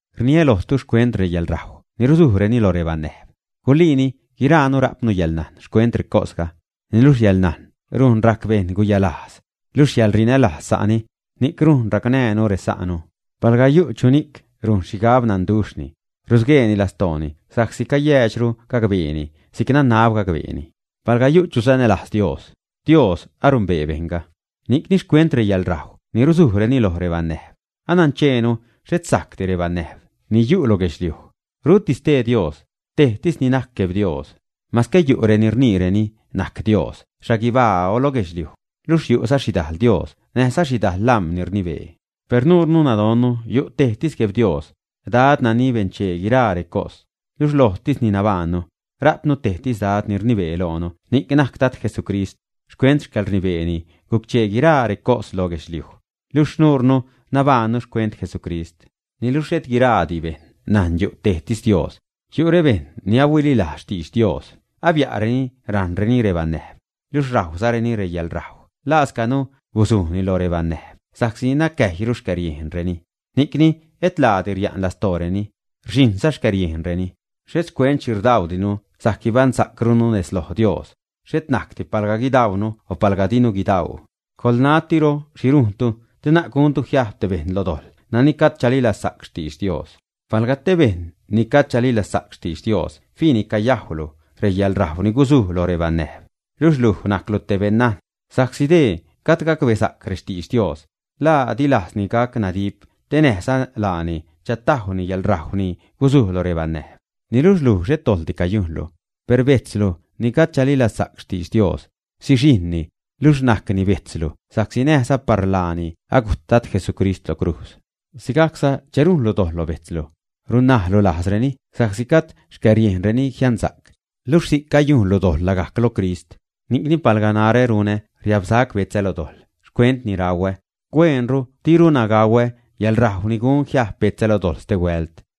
Rniä lojtu xcuent reyäḻrajw ni ruzujreni lo rebanäjb. Guliini guiraanu rajpnu yäḻnajn xcuent recosga. Niluxh yäḻnajn rujn rajc bejṉ guyalajz. Luxh yäḻrinälajz sa'ni, ni'c rujn racnäjnu resa'nu. Palga yu' chuni'c rujn xhigab nanduxhni, rusgueeni lastooni sa'csi cayäädxru gacbeeni si'c ni nanab gacbeeni. Palga yu' chu sanälajz Dios, Dios anumbee bejṉga. Ni'cni, xcuent reyäḻrajw ni risujreni loj rebanäjb, anancheenu xhet sajcdi rebanäjb ni yu' lo guedxliuj, ruti stee Dios; tejtis ni najc Gueb Dios. Masque yu' reni rniireni najc “dios” xhaguibaa o loj guedxliuj, luxh yu'za xhidajl “dios” näjza xhidajl lam̲ ni rnibee, per nuurnu nadonnu yu' tejtis Gueb Dios, Dad nani benchee guiraa recos, luxh lojtisni nabajṉnu. Rajpnu tejtis Dad ni rnibee loonu, ni'c najc Jesucrist. Xcuent xcäḻrnibeeni guc-chee guiraa recos loj guedxliuj, luxh nuurnu nabajṉnu xcuent Jesucrist. Niluxh xhet guira'ti bejṉ najn yu' tejtis Dios. Yu' rebejṉ ni ahuililajz xtidx Dios abia'reni rajṉreni rebanäjb, luxh rajwzareni reyäḻrajw lascanu guzujni loj banäjb sa'csi nacäjyru xcäriejnreni, ni'cni et laadi ria'n lastooreni, rxhiṉza xcäriejnreni. Xhet xcuent xhi rdaudinu sajc guibaṉsa'crunu lo xnejz Dios. Xhet najcdi palga guidaunu o palga dinu guidau. Coḻnatiro xhi rujntu te na'c guntu jiajb te bejṉ lo dojḻ nani gajd chalilazsa'c xtidx Dios. Palga te bejṉ ni gajd chalilazsa'c xtidx Dios fiini cayajwlu reyäḻrajw ni guzuj lo rebanäjb, luxh luj najclu te beṉnajn, sa'csi dee gajd gacbesa'c rextidx Dios, ¿la di lajzni gac nadip te näjza laani chatajwni yäḻrajw ni guzuj lo rebanäjb? Niluxh luj, xhet dojḻdi cayujnlu, per bejtzlu ni gajd chalilazsa'c xtidx Dios, sixijṉni, luxh najcni bejtzlu sa'csi näjza par laani gujt Dad Jesucrist lo crujz. Si'cza che rujnlu dojḻ lo bejtzlu, runnajlu lajzreni sa'csi gajd xcäriejnreni jiansa'c, luxh si'c cayujnzalu dojḻ lagajc lo Crist. Ni'cni, palga narä runä riabsac betzä lo dojḻ xcuent ni rauä, hueenru dirunä gauä yäḻrajw ni gun jiajb betzä lo dojḻ stehuält.